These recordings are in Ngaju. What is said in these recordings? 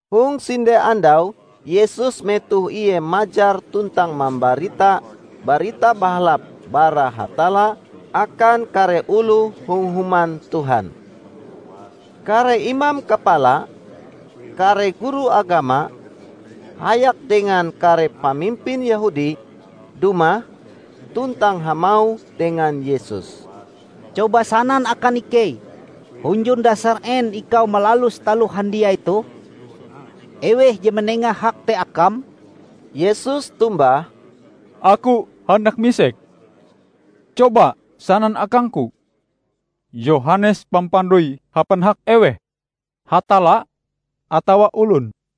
Hong sinde andau Yesus metoh Ie majar tuntang mambarita Barita Bahalap bara Hatalla akan kare oloh hong Human Tuhan. Kare imam kapala, kare guru agama, hayak dengan kare pamimpin Yehudi, dumah, tuntang hamauh dengan Yesus, "Coba sanan akan ikei hunjun dasar en ikau malalus taloh handiai toh? Eweh je manenga hak te Akam?" Yesus tombah, "Aku handak misek. Coba sanan akang-Ku, Yohanes Pampandoi hapan hak eweh? Hatalla atawa olon?"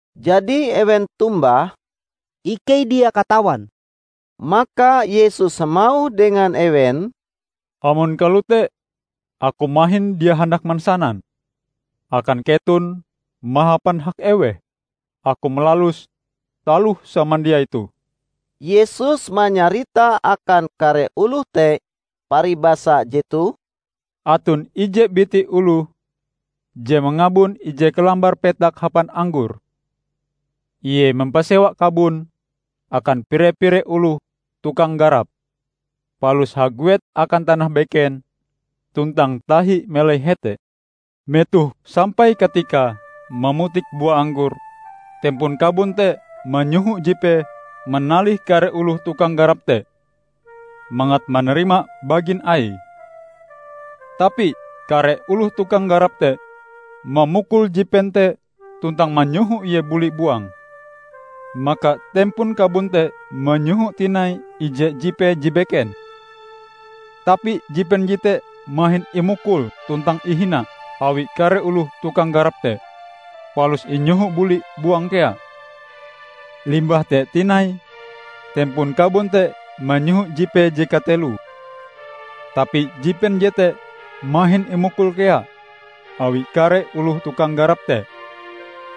Jadi ewen tombah, "Ikei dia katawan." Maka Yesus hamauh dengan ewen, "Amon kalote Aku mahin dia handak mansanan akan keton mahapan hak eweh Aku malalus taloh samandiai toh." Yesus manyarita akan kare oloh te paribasa jetoh, "Aton ije biti oloh je mangabun ije kalambar petak hapan anggor. Ie mampasewa kabon akan pire-pire oloh tukang garap palus haguet akan tanah beken tuntang tahi melai hete. Metoh sampai katikae mamutik bua anggor, tempon kabon te manyoho jipee manalih kare oloh tukang garap te mangat manarima bagin aie. Tapi kare oloh tukang garap te mamukul jipen te tuntang manyoho ie buli buang. Maka tempon kabon te manyoho tinai ije jipee je beken; tapi jipen jete mahin imukul tuntang ihina awi kare oloh tukang garap te, palus inyohoe buli buang kea. Limbah te tinai tempon kabon te manyoho jipee je kateloe. Tapi jipen jete mahin imukul kea awi kare oloh tukang garap te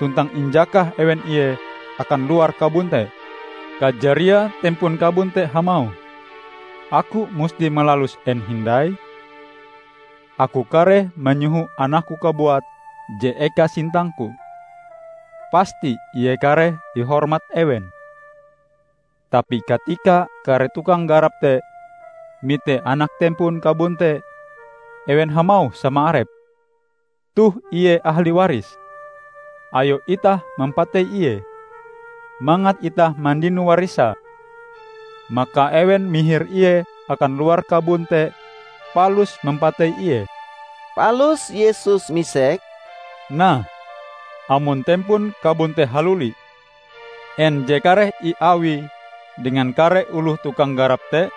tuntang injakah ewen ie akan luar kabon te. Kajariae tempon kabon te hamauh, 'Aku musti malalus en hindai? Aku kareh manyoho anakku kabuat je eka sintangku. Pasti ie kareh ihormat ewen!' Tapi katika kare tukang garap te mite anak tempon kabon te, ewen hamauh sama arepe, 'Toh ie ahli warise. Ayo itah mampatei ie, mangat itah mandino warisae.' Maka ewen mihir ie akan luar kabon te palus mampatei ie." Palus Yesus misek, "Nah, amon tempon kabon te haluli, en je kareh iawie dengan kare oloh tukang garap te?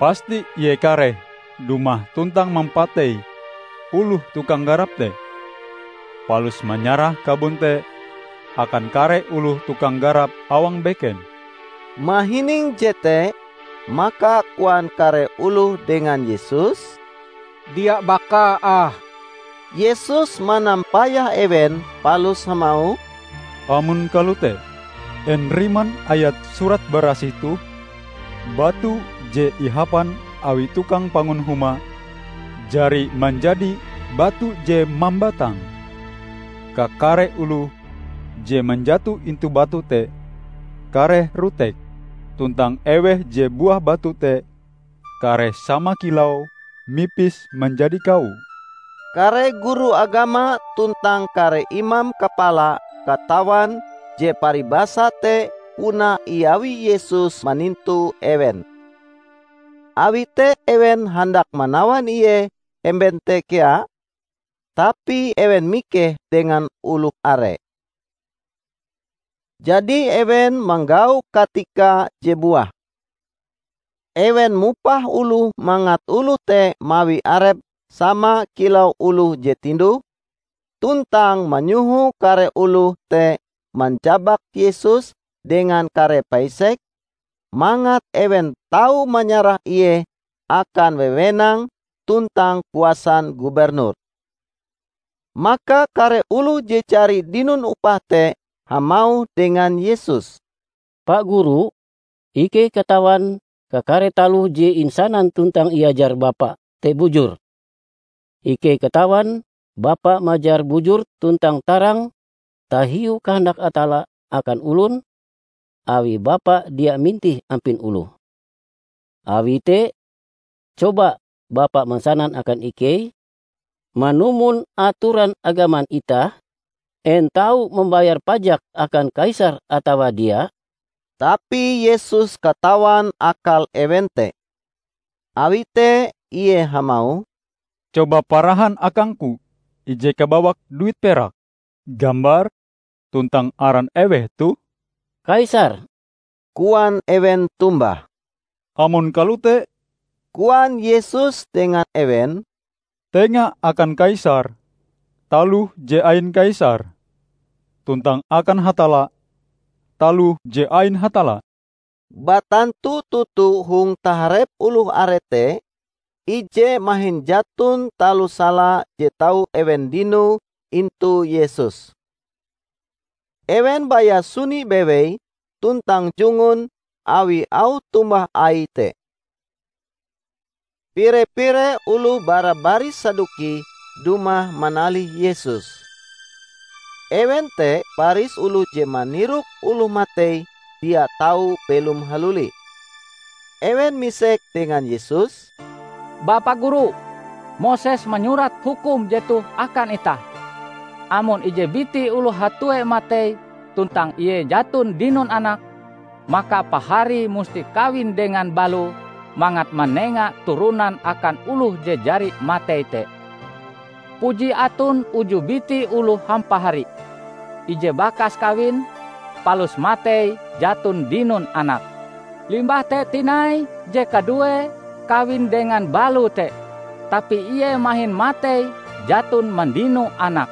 Pasti ie kareh dumah tuntang mampatei oloh tukang garap te, palus manyarah kabon te akan kare oloh tukang garap awang beken." Mahining jete, maka koan kare oloh dengan Yesus, "Dia bakae ah!" Yesus manampayah ewen palus hamauh, "Amon kalote, en riman ayat Surat Barasih toh? 'Batu je ihapan awi tukang pangun huma, jari manjadi batu je mambatang.' Kakare oloh je manjato intu batu te kareh rotek; tuntang eweh je buah batu te kareh sama kilau mipis manjadi kawo." Kare guru agama tuntang kare imam kapala katawan je paribasa te puna iawi Yesus manintu ewen. Awi te ewen handak manawan Ie hemben te kea, tapi ewen mikeh dengan oloh are. Jadi ewen manggau katika je buah. Ewen mupah oloh mangat oloh te mawi arepe sama kilau oloh je tinduh, tuntang manyoho kare oloh te manjabak Yesus dengan kare paisek, mangat ewen tau manyarah ie akan wewenang tuntang kuasan gubernur. Maka kare oloh je jari dinon upah te hamauh dengan Yesus, "Pa Guru, ikei katawan kakare taloh je insanan tuntang iajar Bapa te bujur. Ikei katawan Bapa majar bujur tuntang tarang tahiu kahandak Hatalla akan olon, awi Bapa dia mintih ampin oloh. Awi te coba Bapa mansanan akan ikei, manumon atoran agaman itah, en tau mambayar pajak akan Kaisar atawa dia?" Tapi Yesus katawan akal ewen te. Awi te Ie hamauh, "Coba parahan akangku ije kabawak duit perak. Gambar tuntang aran eweh toh?" "Kaisar!" koan ewen tombah. "Amon kalote," koan Yesus dengan ewen, "tenga akan Kaisar taloh je ain Kaisar tuntang akan Hatalla, taloh je ain Hatalla." Batantu toto hong taharep oloh are te, ije mahin jaton taloh sala je tau ewen dinoe intu Yesus. Ewen baya suni bewei tuntang jungun awi auh tombah Aie te. Pire-pire oloh bara baris Saduki dumah manalih Yesus. (Ewen te baris oloh je manirok oloh matei dia tau belom haluli.) Ewen misek dengan Yesus, "Bapa Guru, Moses manyurat hukum jetoh akan itah: Amon ije biti oloh hatue matei tuntang ie jaton dinon anak, maka paharie musti kawin dengan baloe mangat manenga turonan akan oloh je jari matei te. Puji aton uju biti oloh hampahari. Ije bakas kawin, palus matei jaton dinon anak. Limbah te tinai je kaduee kawin dengan baloe te, tapi ie mahin matei jaton mandino anak.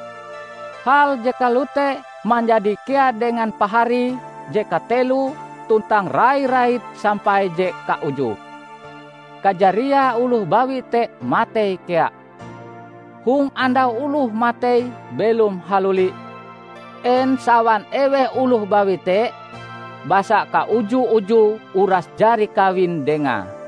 Hal je kalote manjadi kea dengan paharie je kateloe tuntang rai-rait sampai je kaujue. Kajariae oloh bawi te matei kea. Hong andau oloh matei belom haluli, en sawan eweh oloh bawi te? Basa kauju-ujue uras jari kawin dengae."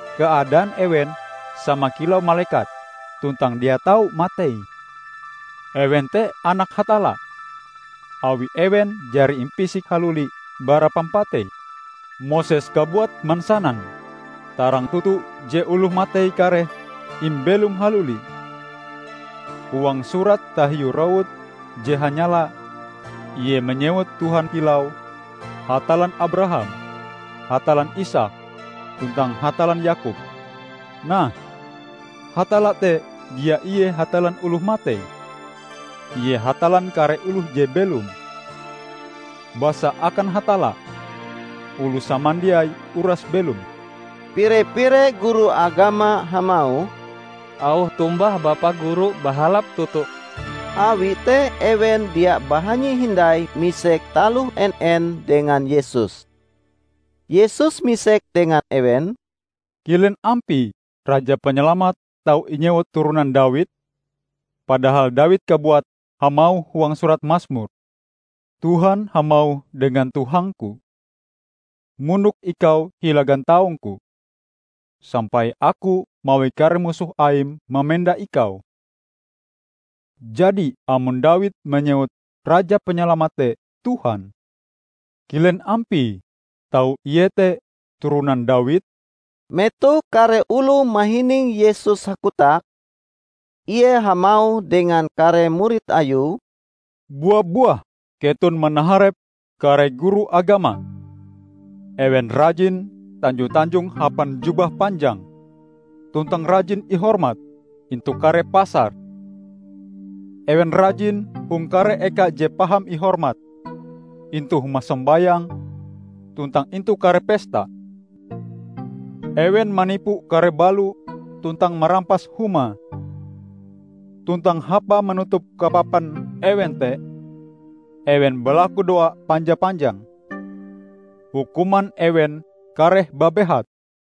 Keadaan ewen sama kilau malekat, tuntang dia tau matei. Ewen te anak Hatalla, awi ewen jari impisik haluli bara pampatei. Moses kabuat mansanan tarang toto je oloh matei kareh imbelom haluli. Huang surate tahiu rowut je hanyala ie manyewut Tuhan kilau 'Hatallan Abraham, Hatallan Isaak tuntang Hatallan Yakob'. Nah, Hatalla te dia ie Hatallan oloh matei! Ie Hatallan kare oloh je belom! Basa akan Hatalla, oloh samandiai uras belom." Pire-pire guru agama hamauh, "Auh tombah Bapa Guru bahalap toto." Awi te ewen dia bahanyi hindai misek taloh en-en dengan Yesus. Yesus misek dengan ewen, "Kilen ampie Raja Panyalamat tau inyewut turonan Dawid? Padahal Dawid kabuat hamauh huang surat Masmur, 'Tuhan hamauh dengan Tuhangku: Mondok Ikau hila gantaung-Ku, sampai Aku mawi kare musoh Aim mamenda Ikau.' Jadi amon Dawid manyewut Raja Panyalamat te 'Tuhan', kilen ampie tau ie te turonan Dawid?" Metoh kare oloh mahining Yesus hakotak, Ie hamauh dengan kare murid Ayue, "Bua-buah keton manaharep kare guru agama. Ewen rajin tanjo-tanjong hapan jubah panjang, tuntang rajin ihormat intu kare pasar. Ewen rajin hong kare eka je paham ihormat intu huma sombayang tuntang intu kare pesta. Ewen manipu kare balo tuntang marampas humae. Tuntang hapae manutup kapapan ewen te, ewen balakudoa panja-panjang! Hukuman ewen kareh babehat!"